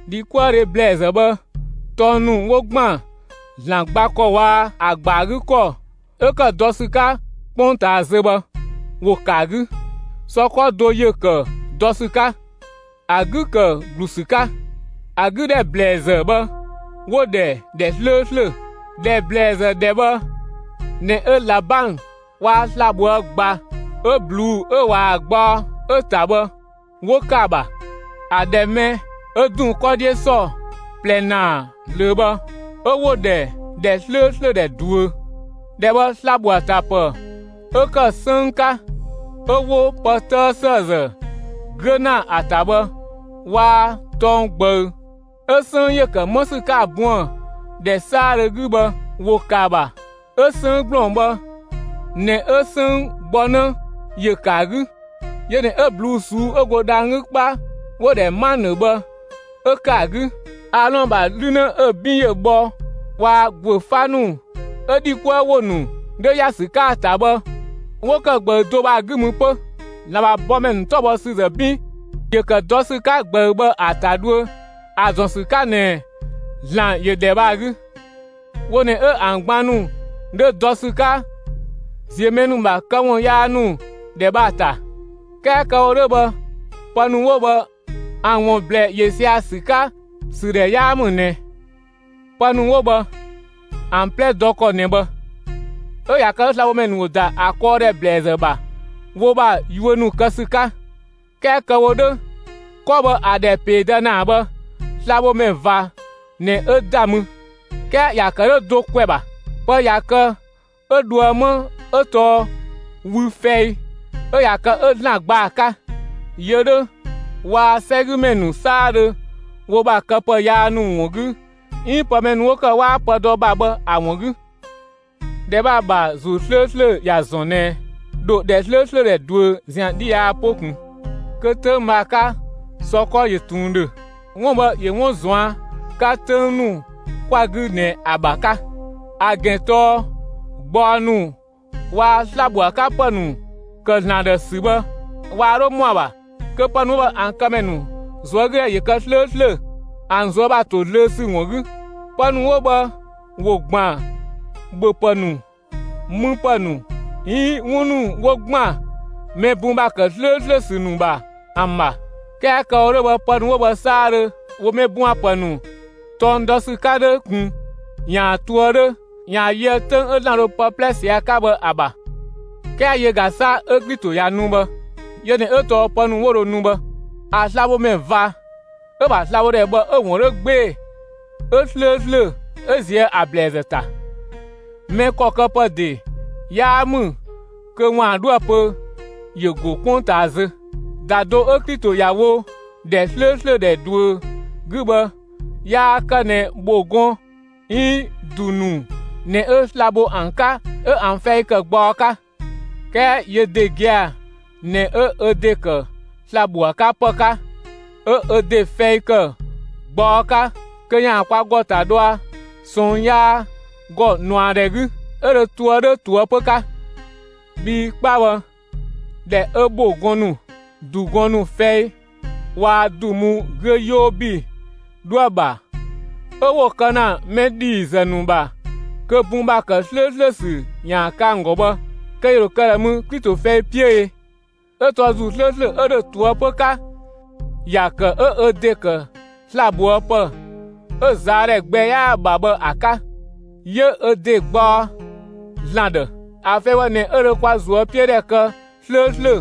‑Dhikuëdhe ‑blɛɛzë bhë tɔng ‑nu 'wo ‑gban ‑Zlan gba ‑kɔ waa‑ ‑a ‑gba 'gü ‑kɔ 'ö ‑kë dɔ ‑sü 'ka 'kpongtaa zö bhë, ‑wo ‑kë ‑a 'gü. Sɔ 'kɔ do ‑yö ‑kë dɔ ‑sü 'ka; ‑a 'gü ‑kë ‑glu ‑sü 'ka. ‑A 'gü ‑dhɛ ‑blɛɛzë bhë, 'wo‑ ‑dhɛ ‑dhɛ 'slööslö. ‑Dhɛ ‑blɛɛzë ‑dhɛ bhë ꞊nɛ 'ö ꞊labang waa‑ sla‑ ꞊bhoë' ꞊gba 'ö ꞊bluu'‑ 'ö ꞊waa‑ gbaɔ 'ö‑ ‑ta bhë 'wo ‑kë ‑a ‑bha; ‑a ‑dhɛ mɛ 'ö ‑dun 'kɔ 'dhiö ‑sɔ ꞊plɛ ‑naa ꞊zlöö bhë, 'ö 'wo‑ ‑dhɛ ‑dhɛ 'slööslö ‑dhɛ ꞊duö. ‑Dhɛ bhë sla‑ ‑bho ‑a ‑ta ‑pë 'ö ‑kë 'sënng 'ka 'ö 'wo pë 'tëë ‑sëëzë 'güö ‑na ‑a ‑ta bhë waa‑ tɔng ꞊gbëü 'ö 'sënng ‑yö ‑kë 'më ‑sü 'ka ‑a buën‑ ‑dhɛ 'saadhö 'gü bhë ‑wo ‑kë ‑a ‑bha. 'Ö 'sënng ‑gblɔng bhë ꞊nɛ 'ö 'sënng gbɔ 'në ‑yö ‑kë ‑a 'gü. Yö ꞊nɛ 'ö ꞊bluu'‑ ꞊suu'‑ 'ö go dhang‑ 'gü 'kpa 'wo‑ ‑dhɛ 'manë bhë 'ö ‑kë ‑a 'gü. Aalɔn ‑bha 'lü 'në 'ö‑ 'bin ‑yö bhɔ waa‑ ‑guö 'fa ‑nu 'ö ‑dhi 'kuë ‑wo ‑nu 'dhö ‑ya ‑sü 'ka ‑a ‑ta bhë 'wo ‑kë ꞊gbëü do bhë ‑a 'gü mü 'pö. ‑Zlan ‑bha bɔmɛ ‑nu 'tɔbhɔsüzë 'bin ‑yö ‑kë dɔ ‑sü 'ka ꞊gbëü bhë ‑a ‑ta dhuö ‑a ‑zɔn ‑sü 'ka ꞊nɛ ‑Zlan ‑yö ‑dhɛ bhë ‑a 'gü. Wo ꞊nɛ 'ö ‑an gban ‑nu 'dhö dɔ ‑sü 'ka ‑ziö mɛ ‑nu ‑bha këwun yaa ‑nu ‑dhɛ bhë ‑a ‑ta. 'Kɛɛ kë‑ wo 'dhö bhë pë ‑nu 'wo bhë ‑an ‑wun ‑blɛɛ ‑yö sia‑ ‑sü 'ka ‑sü ‑dhɛ 'yaa ‑mü ꞊nɛ. Pë ‑nu 'wo bhë, ‑an 'plɛ dɔ ‑kɔ ꞊nɛ bhë; 'ö ꞊ya kë 'ö slabhomɛ ‑nu ‑wo ‑da ‑a kɔɔdhɛ ‑blɛɛzë ‑bha wo ‑bha yuö ‑nu kë ‑sü 'ka. 'Kɛɛ kë‑ wo 'dhö, 'kɔ bhë ‑a ‑dhɛ ‑peedë ‑naa bhë, slabhomɛ ꞊va ꞊nɛ 'ö ‑da mü. 'Kɛɛ ‑ya ‑kë 'dhö do ‑kwɛ ‑bha. Pë ꞊ya kë 'ö dhoë 'ma 'ö tɔɔ wü fɛi 'ö ꞊ya kë 'ö ‑Zlan gba ‑a 'ka, yö 'dhö waa‑ 'sɛgümɛ ‑nu 'saadhö wo ‑bha këpë yaa ‑nu ‑wun 'gü 'iin pë mɛ ‑nu 'wo ‑kë 'waa pë dɔ ‑bha bhë ‑a ‑wun 'gü. ‑Dhɛ bhë ‑a ‑bha ‑Zuu 'slööslö ‑ya ‑zɔn ꞊nɛ ‑dho ‑dhɛ 'slööslö ‑dhɛ ꞊duö ‑zian 'dhi yaa 'po ꞊kun, kö 'töng bhë ‑a 'ka sɔ 'kɔ ‑yö ꞊tun ‑dhö. 'Wun bhë ‑yö 'wun ꞊zuan' 'ka 'töng ‑nu 'kwa‑ 'gü ꞊nɛ ‑an ‑bha 'ka. ‑A ‑gɛn tɔɔ gbaɔ ‑nu waa‑ sla‑ ‑bho ‑a 'ka ‑pë ‑nu ‑kë ‑Zlan ‑dhë ‑sü bhë waa 'dho ‑mɔa ‑bha kö pë ‑nu 'wo bhë ‑a këmɛ ‑nu ꞊zuögüdhɛ ‑yö kë 'slööslö, ‑an ꞊zuö' ‑bha ‑to zlöö ‑sü ‑wun 'gü. Pë ‑nu 'wo bhë ‑wo ‑gban ‑bhöpë ‑nu, müpë ‑nu 'iin 'wun ‑nu 'wo ‑gban mɛ bun ‑bha ‑kë 'slööslö ‑sü ‑nu ‑bha ‑an ‑bha. 'Kɛɛ kë‑ wo 'dhö bhë, pë ‑nu 'wo bhë 'saadhö ‑wo mɛ bun ‑bha ‑pë ‑nu tɔng dɔ ‑sü 'ka 'dhö ꞊kun ‑yaan ꞊toë' 'dhö ‑yaan yöë 'töng 'ö ‑Zlan dho pë 'plɛ ꞊sië' ‑a 'ka bhë ‑a ‑bha. 'Kɛɛ yö ꞊ga 'sa 'ö Klito ꞊ya nu bhë; yö ꞊nɛ 'ö tɔɔ pë ‑nu 'wo dho nu bhë, ‑a slabhomɛ ꞊va 'ö‑ ‑bha slabhodhɛ bhë 'ö‑ ‑wun 'dhö 'gbee‑, 'ö 'slööslö 'ö ꞊zië' ‑a ‑blɛɛzë ‑ta. Mɛ ‑kɔ këpë ‑de 'yaa ‑mü kö ‑waan 'dhoë‑ pö ‑yö ‑go 'kpongtaa zö. ‑Da do 'ö Klito ‑ya wo ‑dhɛ 'slööslö ‑dhɛ ꞊duö 'gü bhë yaa kë ꞊nɛ ‑bho gɔn 'iin ‑du ‑nu ꞊nɛ 'ö sla‑ bho ‑an 'ka 'ö ‑an fɛi kë gbaɔ 'ka; 'kɛɛ yö ‑de gia‑ ꞊nɛ 'ö ö ‑de kë sla‑ ‑bho ‑a 'ka ‑pë 'ka 'ö ö ‑de fɛi ‑kë gbaɔ 'ka kö ‑yaan kwa ‑gɔ ‑ta dhɔa ꞊sɔɔn yaa ‑gɔ ꞊nuadhɛ 'gü, 'ö dhö toë 'dhö ꞊toëpö 'ka. Bhii 'kpa bhë, ‑dhɛ 'ö ‑bho gɔn ‑nu, ‑du gɔn ‑nu fɛi waa‑ ‑du mu 'güö 'yoo ‑bi 'dhoë‑ ‑bha 'ö 'wo‑ kë ‑na mɛ ‑dhiizë ‑nu ‑bha kö bun ‑bha ‑kë 'slööslö ‑sü ‑yaan kë ‑an ‑gɔ bhë, kö ‑yö ‑dho kë ꞊dhë mü Klito fɛi 'piö ee! 'Ö tɔɔ ‑Zuu 'slööslö 'ö ‑dhö ꞊toëpö 'ka, ‑ya ‑kë 'ö ö ‑de ‑kë sla‑ ꞊bhoë' pë 'ö‑ ꞊zaadhɛ gbɛ 'yaa‑ ‑bha bhë ‑a 'ka; 'yö ö ‑de gbaɔ ‑Zlan ‑dhë. ‑A fɛi bhë ꞊nɛ 'ö dho kwa ꞊zuöpiödhɛ kë 'slööslö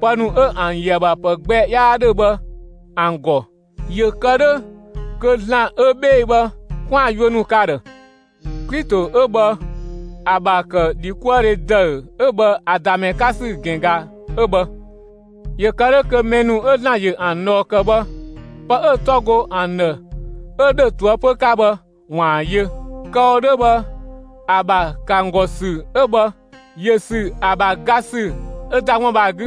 pë ‑nu 'ö ‑an ‑yö ‑a ‑bha ‑pë gbɛ 'yaa 'dhö bhë ‑an ‑gɔ, ‑yö kë 'dhö kö ‑Zlan 'ö 'bhee‑ bhë, 'kwaan‑ yuö ‑nu kë ‑a ‑dhë. Klito 'ö bhë ‑a ‑bha ‑kë ‑dhikuëdhe ‑dëü 'ö bhë ‑a ‑da ‑mɛ 'ka ‑sü ‑gɛn ꞊ga 'ö bhë; ‑yö kë 'dhö kö mɛ ‑nu 'ö ‑Zlan ‑yö ‑an ꞊dhɔɔ ‑kë bhë, pë 'ö‑ 'tɔ go ‑an ‑dhë 'ö ‑dhö ꞊toëpö 'ka bhë, ‑waan yö. Kë‑ wo 'dhö bhë, ‑a ‑bha ‑kë ‑an ‑gɔ ‑sü 'ö bhë, ‑yö ‑sü ‑a ‑bha ga ‑sü 'ö ‑da 'wun bhë ‑a 'gü,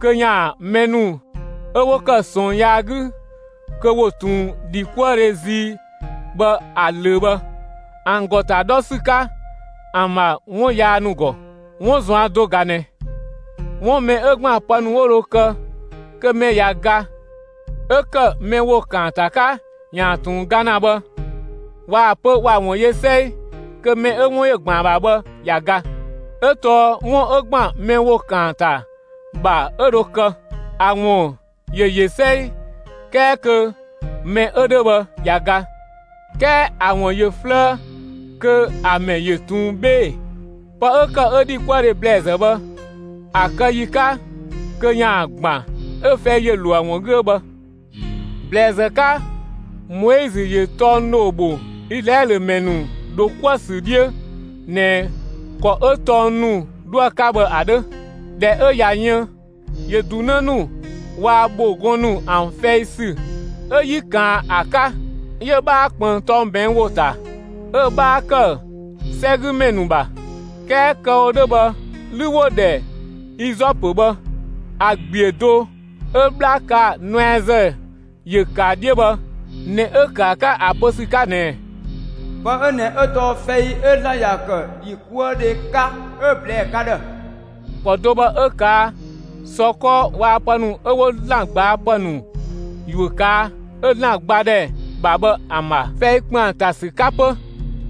kö ‑yaan mɛ ‑nu 'ö 'wo ‑kë ꞊sɔɔn yaa 'gü kö ‑wo ꞊tun ‑dhikuëdhe zii bhë ‑a ꞊löö bhë, ‑an ‑gɔ ‑ta 'dhɔ ‑sü 'ka ‑an ‑bha 'wun yaa ‑nu ‑gɔ. 'Wun ꞊zuan' do ga ꞊nɛ. 'Wun mɛ 'ö ‑gban pë ‑nu 'wo dho kë kö mɛ ꞊ya ga 'ö ‑kë mɛ ‑wo ‑kaanta 'ka ‑yaan ꞊tun ga ‑na bhë, ꞊waa‑ pö ‑wa ‑wun yö 'sɛi, kö mɛ 'ö 'wun ‑yö ‑gban ‑a ‑bha bhë ꞊ya ga. 'Ö tɔɔ 'wun 'ö ‑gban mɛ ‑wo ‑kaanta ‑bha 'ö dho kë, ‑a ‑wun ‑yö ‑yö 'sɛi 'kɛɛ kö mɛ 'ö 'dhö bhë ꞊ya ga, 'kɛɛ ‑a ‑wun ‑yö 'flëë kö ‑a ‑mɛ ‑yö ꞊tun 'bhee‑. Pë 'ö ‑kë 'ö ‑dhikuëdhe ‑blɛɛzë bhë, ‑a kë ‑yi 'ka kö ‑yaan ‑gban, 'ö fɛi ‑yö ‑lo ‑a ‑wun 'gü 'ö bhë. ‑Blɛɛzë 'ka, Moizö ‑yö tɔng ‑dhoo ‑bho Izlaɛlö ‑mɛ ‑nu ‑dho 'kuë‑ ‑sü 'dhiö ꞊nɛ ‑kɔ 'ö tɔng ‑nu 'dhoë‑ 'ka bhë ‑a 'dhö. ꞊Dhɛ 'ö ꞊ya yën, ‑yö ‑du 'në ‑nu waa‑ ‑bho gɔn ‑nu ‑an fɛi ‑sü 'ö 'yi ꞊kaan ‑a 'ka; 'yö‑ 'bhaa ꞊kpënng tɔng ꞊bɛɛn' ‑wo ‑ta; 'ö‑ 'bhaa ‑kë 'sɛgümɛ ‑nu ‑bha; 'kɛɛ kë‑ wo 'dhö bhë, 'lü 'wo‑ ‑dhɛ izɔpö bhë, ‑a ‑gbiö do 'ö 'bhla kaa‑ nuɛazë ‑yö ‑kë ‑a 'dhiö bhë ꞊nɛ 'ö‑ ‑kë ‑a 'ka ‑a pö ‑sü 'ka ꞊nɛɛ: Pë 'ö ꞊nɛ 'ö tɔɔ fɛi 'ö ‑Zlan ‑ya ‑kë ‑dhikuëdhe 'ka 'ö‑ ꞊blɛɛ ka ‑dhë. ‑Kɔ do bhë 'ö‑ ꞊kaa' sɔ 'kɔ waa‑ pë ‑nu 'ö 'wo ‑Zlan ꞊gbaa' ‑pë ‑nu ‑yuö ꞊kaa', 'ö‑ ‑Zlan gbadhɛ ‑bha bhë ‑an ‑bha, fɛi ‑kpëng ‑an ‑ta ‑sü 'ka 'pö.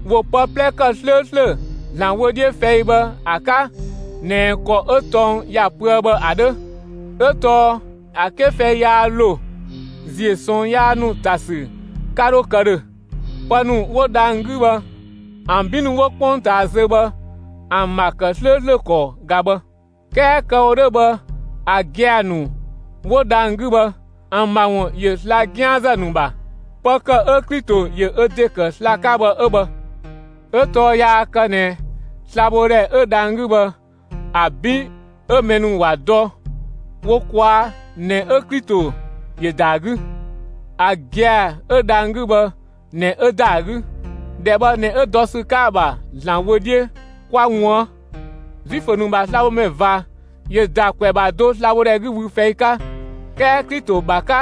‑Wo pë 'plɛ ‑kë 'slööslö ‑Zlan wö 'dhiö fɛi bhë ‑a 'ka ꞊nɛ ‑kɔ 'ö tɔng ‑ya pöë bhë ‑a 'dhö; 'ö tɔɔ ‑a 'ke fɛi yaa ‑lo, ‑ziö ꞊sɔɔn yaa ‑nu ‑ta ‑sü 'ka 'dhö kë ‑dhö. Pë ‑nu 'wo dhang‑ 'gü bhë ‑an 'bin ‑nu 'wo 'kpongtaa zö bhë ‑an ‑bha ‑kë 'slööslö ‑kɔ ꞊ga bhë. 'Kɛɛ kë‑ wo 'dhö bhë ‑a gia‑ ‑nu 'wo dhang‑ 'gü bhë ‑an ‑bha ‑wun ‑yö sla‑ 'gianzë ‑nu ‑bha. Pë ‑kë 'ö Klito ‑yö ö ‑de ‑kë sla‑ 'ka bhë 'ö bhë. 'Ö tɔɔ yaa kë ꞊nɛ slabhodhɛ 'ö dhang‑ 'gü bhë ‑a 'bin 'ö mɛ ‑nu ‑wa dɔ wo ꞊kwaa' ꞊nɛ 'ö Klito ‑yö ‑da ‑a 'gü. ‑A gia‑ 'ö dhang‑ 'gü bhë ꞊nɛ 'ö ‑da ‑a 'gü; ‑dhɛ bhë ꞊nɛ 'ö dɔ ‑sü 'ka ‑a ‑bha ‑Zlan wö 'dhiö kwa ꞊wuën'. Zuifö ‑nu ‑bha slabhomɛ ꞊va ‑yö ‑da ‑kwɛ ‑bha do sla‑ bho ‑dhɛ 'gü wü fɛi 'ka; 'kɛɛ Klito ‑bha 'ka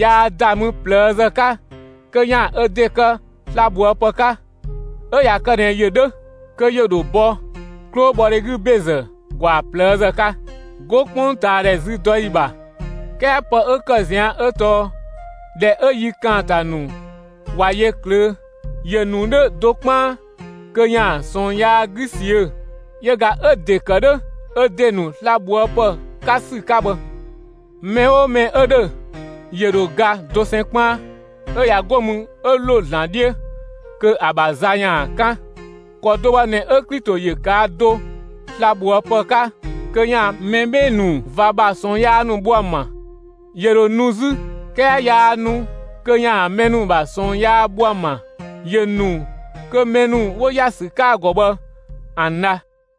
yaa ‑da mü ꞊plëëzë 'ka kö ‑yaan ö ‑de kë slabhoëpë 'ka. 'Ö ꞊ya kë ꞊nɛ ‑yö 'dhö, kö ‑yö ‑dho bɔ 'klobhɔdhe 'gü ‑bezë ‑gwaa ꞊plëëzë 'ka, 'go 'kpongtaadhɛ züdɔyi ‑bha. 'Kɛɛ pë 'ö ‑kë ꞊zian' 'ö tɔɔ ‑dhɛ 'ö yi ‑kaanta ‑nu ꞊wa yö ꞊klöö', ‑yö ‑nu 'dhö do 'kpaan kö ‑yaan ꞊sɔɔn yaa 'gü ꞊siö'‑; yö ꞊ga 'ö‑ ‑de ‑kë 'dhö ö ‑de ‑nu slabhoëpë 'ka ‑sü 'ka bhë. Mɛ 'oo mɛ 'ö ‑dhö, ‑yö ‑dho ga dosɛn 'kpaan; 'ö ꞊ya 'go mü 'ö ‑lo ‑Zlan 'dhiö kö ‑a ‑bha za ‑yaan 'kan. ‑Kɔ do bhë ꞊nɛ 'ö Klito ‑yö ꞊kaa' do slabhoëpë 'ka kö ‑yaan mɛ 'bhee‑ ‑nu ꞊va ‑bha ꞊sɔɔn yaa ‑nu bho ‑an ‑bha. ‑Yö ‑dho nu 'zü; 'kɛɛ yaa nu kö ‑yaan mɛ ‑nu ‑bha ꞊sɔɔn yaa bho ‑an ‑bha; ‑yö ‑nu kö mɛ ‑nu 'wo ‑ya ‑sü 'ka ‑a ‑gɔ bhë, ‑an dha.